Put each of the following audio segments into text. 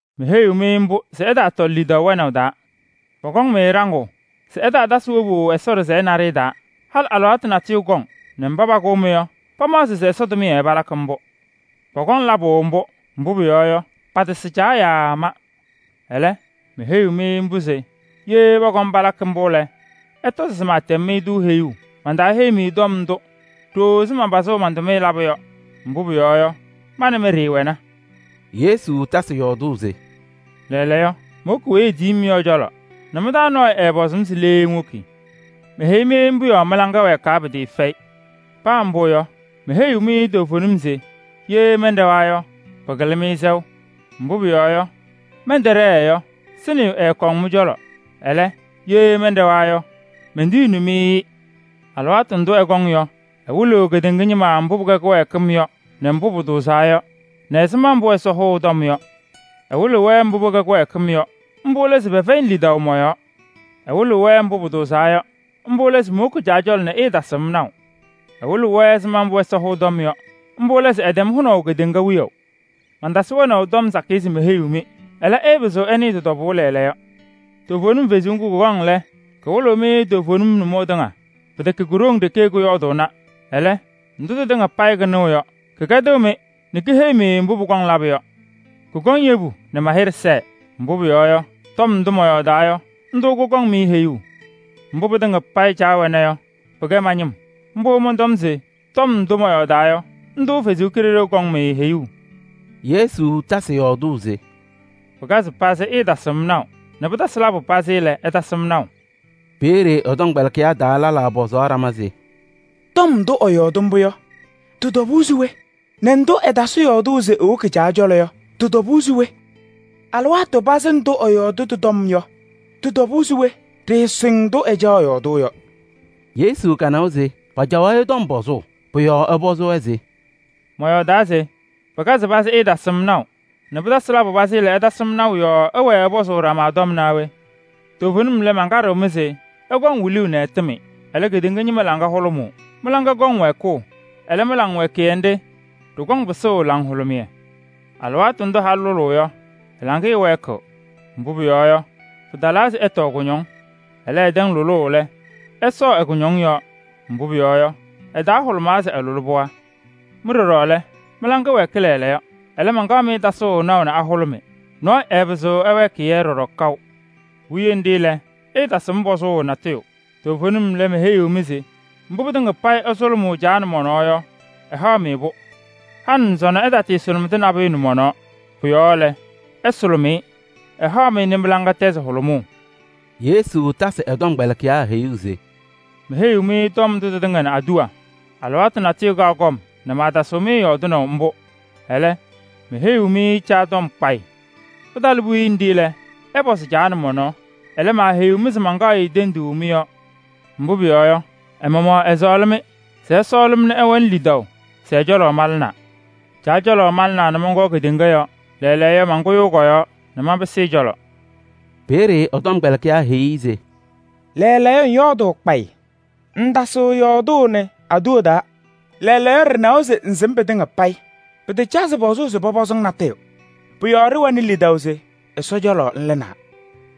Meheyiɣ-mɩ mbʋ se ɩtaatɔlɩ lidaʋ nʋmɔʋ taa. Pɔkɔŋ-mɩ ɖaŋʋʋ se ɩtaatasɩ wobu Ɛsɔ ɖɩsɛyɛ naɖɩyɛ taa. Halɩ alɩwaatʋ natʋyʋ kɔŋ nɛ mba pakʋʋ-mɩ yɔ, pamaɣzɩ se Ɛsɔ tʋmɩyɛ palakɩ mbʋ. Pɔkɔŋ labʋ mbʋ, mbʋ pʋyɔɔ yɔ, patasɩ Caa yaa ma. Ɛlɛ, meheyi-mɩ mbʋ se ye pɔkɔm palakɩ mbʋ lɛ, ɩtɔzɩ se maatɛm-mɩ-tʋ heyuu. Mbʋ Ɛsɔ Kalɩzaɣ lakɩ yɔ Mantaaheyi-mɩ tɔm ndʋ ɖooo ɛzɩ manpazʋʋ man-tʋmɩyɛ labʋ yɔ, mbʋ pʋyɔɔ yɔ, ma nɛ mɩ ɖɩɩwɛna.” Yesu tasɩ yɔɔdʋʋ se: “Lɛɛlɛɛyɔ, mowoki weyi etiyi-m yɔ ɛ-cɔlɔ nɛ mɩ-taa nɔɔyʋ ɛɛpɔzʋʋ-m se: ‘Le ŋwoki?’ Meheyi-mɩ mbʋ yɔɔ mɩ-laŋa wɛɛkɩ pɩtɩɩfɛyɩ. Paa mbʋ yɔ, meheyiɣ-mɩ toovenim se: ye mɛnɖɛwa yɔ, pɩkɩlɩɣ-mɩ sɛʋ. Mbʋ pʋyɔɔ yɔ, mɛntɛɖɛɛ yɔ, Sɩnɩyʋ ɛɛkɔŋ mɩ-cɔlɔ. Ɛlɛ, ye mɛnɖɛwa yɔ, mentiyiɣni-mɩ-ɩ. Alɩwaatʋ ndʋ ɛkɔŋ yɔ, ɛwɩlɩɣ kedeŋa ñɩma mbʋ pɩkɛ kɩwɛɛkɩm yɔ nɛ mbʋ pʋtʋʋzaa yɔ nɛ ɛzɩma mbʋ Ɛsɔ hʋʋ tɔm yɔ. Ɛwɩlɩɣ-wɛ mbʋ pɩkɛ kɩwɛɛkɩm yɔ, mbʋ lɛ se pɛfɛyɩnɩ lidaʋ mɔ-yɔɔ. Ɛwɩlɩɣ-wɛ mbʋ pʋtʋʋzaa yɔ, mbʋ lɛ se mowoki Caa cɔlɔ nɛ ɩɩtasɩɣ-m naʋ. Ɛwɩlɩɣ-wɛ ɛzɩma mbʋ Ɛsɔ hʋʋ tɔm yɔ, mbʋ lɛ se ɛtɛm hʋnaʋ kedeŋa wiyaʋ. Mantasɩ wɛnaʋ tɔm sakɩyɛ se meheyiɣ-mɩ, ɛlɛ, ɩɩpɩzɩɣ ɩnɩɩ tɩ-tɔbʋʋ lɛɛlɛɛyɔ. Toovenim Kalɩzaɣ ŋga, kɔkɔŋ lɛ, kawɩlɩ-mɩ toovenim nʋmɔʋ tɩŋa. Pɩtɛkɛ ko-ɖoŋ ɖeke kɔyɔɔdʋʋna. Ɛlɛ, ndʋ tɩtɩŋa payɩ kanɩɣ yɔ, kɛkɛdɩɣ-mɩ nɛ keheyi-mɩ mbʋ pʋkɔŋ labʋ yɔ. Kɔkɔŋ yebu nɛ ma-hɩɖɛ sɛɛ, mbʋ pʋyɔɔ yɔ, tɔm ndʋ mɔyɔɔdaa yɔ, ndʋ kɔkɔŋ-mɩ heyuu. Mbʋ pɩtɩŋa payɩ Caa wɛna yɔ, pɩkɛ ma-ñɩm. Pʋ-yɔɔ mɔntɔm se tɔm ndʋ mɔyɔɔdaa yɔ, ndʋ Ɛsɔ Kalɩzaɣ kɔŋ-mɩ heyuu.” Yesu tasɩ yɔɔdʋʋ se: “Pɩkazɩ pazɩ, ɩɩtasɩɣ-m naʋ nɛ pɩtasɩ labʋ pazɩ lɛ, ɩtasɩ-m naʋ.” Peeye ɛ-tɔmkpɛlɩkɩyaa taa lɛlaa pɔzaɣ ɖama se: “Tɔm ndʋ ɛyɔɔdɩ mbʋ yɔ, tɩ-tɔbʋʋ se we? Nɛ ndʋ ɛtasɩ yɔɔdʋʋ se ewoki Caa cɔlɔ yɔ, tʋtʋ tɔbʋʋ se we? Alɩwaatʋ pazɩ ndʋ ɛyɔɔdʋʋ tɩ-tɔm yɔ, tɩ-tɔbʋʋ se we? Ɖɩɩsɩŋ ndʋ ɛcaɣ yɔɔdʋʋ yɔ.” Yesu kanawa se pacaɣ-ɩ tɔm pɔzʋʋ. Pʋ-yɔɔ ɛpɔzɩ-wɛ se: “Mɔyɔɔdaa se: ‘Pɩkazɩ pazɩ ɩɩtasɩɣ-m naʋ nɛ pɩtasɩ labʋ pazɩ lɛ, ɩtasɩ-m naʋ’ yɔɔ ɩwɛɛ ɩpɔzʋʋ ɖama tɔm naa we? Toovenim lɛ, mankaɖɩɣ-mɩ se: ɩkɔŋ wiluu nɛ ɩtɩmɩ. Ɛlɛ, kedeŋa ñɩma laŋa hʋlʋmʋʋ. Mɩ-laŋa kɔŋ wɛɛkʋʋ, ɛlɛ, mɩ-laŋwɛɛkɩyɛ nɖɩ, ɖɩkɔŋ pɩsʋʋ laŋhʋlʋmɩyɛ. Alɩwaatʋ ndʋ halʋ lʋlʋʋ yɔ, ɛ-laŋɩyɛ wɛɛkɩɣ. Mbʋ pʋyɔɔ yɔ, pɩtalaa se ɛtɔɔ kʋñɔŋ. Ɛlɛ, ɛtɛŋ lʋlʋʋ lɛ, ɛsɔɔ ɛ-kʋñɔŋ yɔɔ, mbʋ pʋyɔɔ yɔ, ɛ-taa hʋlʋmaa se ɛlʋlɩ pɩɣa. Mɩ ɖɔɖɔ lɛ, mɩ-laŋa wɛɛkɩ lɛɛlɛɛyɔ. Ɛlɛ, mankaɣ-mɩ tasʋʋ naʋ nɛ ahʋlʋmɩ, nɔɔyʋ ɛɛpɩzɩɣ ɛwɛɛkɩ-yɛ ɖɔɖɔ kaʋ. Puwiye nɖɩ lɛ, ɩɩtasɩɣ-m pɔzʋʋ natʋyʋ. Toovenim lɛ, meheyiɣ-mɩ se: mbʋ pɩtɩŋa payɩ ɩsʋlʋmʋʋ Caa nɛ mɔ-nɔɔ yɔ, ɛhaɣ-mɩ-pʋ. Halɩ nɛ sɔnɔ ɩtaasʋlʋmɩdɩ nabʋyʋ nɛ mɔ-nɔɔ. Pʋ-yɔɔ lɛ, ɩsʋlʋmɩ-ɩ, ɛhaɣ-mɩ nɛ mɩ-laŋa tɛzɩ hʋlʋmʋʋ.” Yesu tasɩ ɛ-tɔmkpɛlɩkɩyaa heyuu se: “Meheyi-mɩ tɔm ndʋ tɩtɩŋa nɛ aduwa taa. Alɩwaatʋ natʋyʋ kaɣ kɔm nɛ maatasɩɣ-mɩ yɔɔdɩnaʋ mbʋ. Ɛlɛ, meheyiɣ-mɩ Caa tɔm kpayɩ. Pɩtalɩ puwiye nɖɩ lɛ, ɩpɔzɩ Caa nɛ mɔ-nɔɔ. Ɛlɛ, maaheyiɣ-mɩ se mankaɣ-ɩ tenduu mɩ-yɔɔ. Mbʋ pʋyɔɔ yɔ, ɛ-maɣmaɣ ɛsɔɔlɩ-mɩ se ɩsɔɔlɩ-m nɛ ɩwɛnɩ lidaʋ se ɛ-cɔlɔ malɩnaa. Caa cɔlɔ malɩnaa nɛ mɔnkɔɔ kedeŋa yɔɔ. Lɛɛlɛɛyɔ, mankʋyʋʋ kɔ-yɔɔ nɛ manpɩsɩ ɛ-cɔlɔ.” Peeye ɛ-tɔmkpɛlɩkɩyaa heyi-i se: “Lɛɛlɛɛyɔ ŋyɔɔdʋʋ kpayɩ, ŋŋtasɩɣ yɔɔdʋʋnɩ aduwa taa. Lɛɛlɛɛyɔ ɖɩnawa se ŋsɩm pɩtɩŋa payɩ, pɩtacazɩ pɔzʋʋ se pɔpɔzɩ-ŋ natʋyʋ. Pʋ-yɔɔ ɖɩwɛnɩ lidaʋ se Ɛsɔ cɔlɔ ŋlɩnaa.”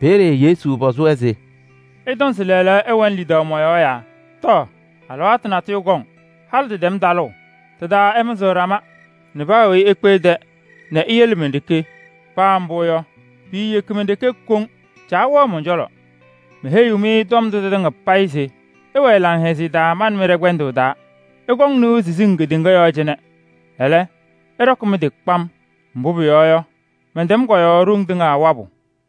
Peeye Yesu pɔzɩ-wɛ se: “Ɩtɔŋ se lɛɛlɛɛyɔ ɩwɛnɩ lidaʋ mɔ-yɔɔ yaa? Tɔ! Alɩwaatʋ natʋyʋ kɔŋ, halɩ tɩtɛm talʋʋ. Tɩ-taa ɩmɩzɩɣ ɖama nɛ paa weyi ekpe ɛ-tɛ nɛ iyele men-ɖeke. Paa mbʋ yɔ, piiyeki men-ɖeke koŋ, Caa wɛɣ mɔn-cɔlɔ. Meheyi-mɩ tɔm ndʋ tɩtɩŋa payɩ se ɩwɛɛ laŋhɛzɩyɛ taa ma nɛ mɩ ɖɛ-kpɛndʋʋ taa. Ɩkɔŋ nɩʋ siziŋ kedeŋa yɔɔ cɩnɛ. Ɛlɛ, ɩɖɔkɩ mɩ-tɩ kpam! Mbʋ pʋyɔɔ yɔ, mɛntɛm kɔ-yɔɔ ɖoŋ tɩŋa wabʋ!”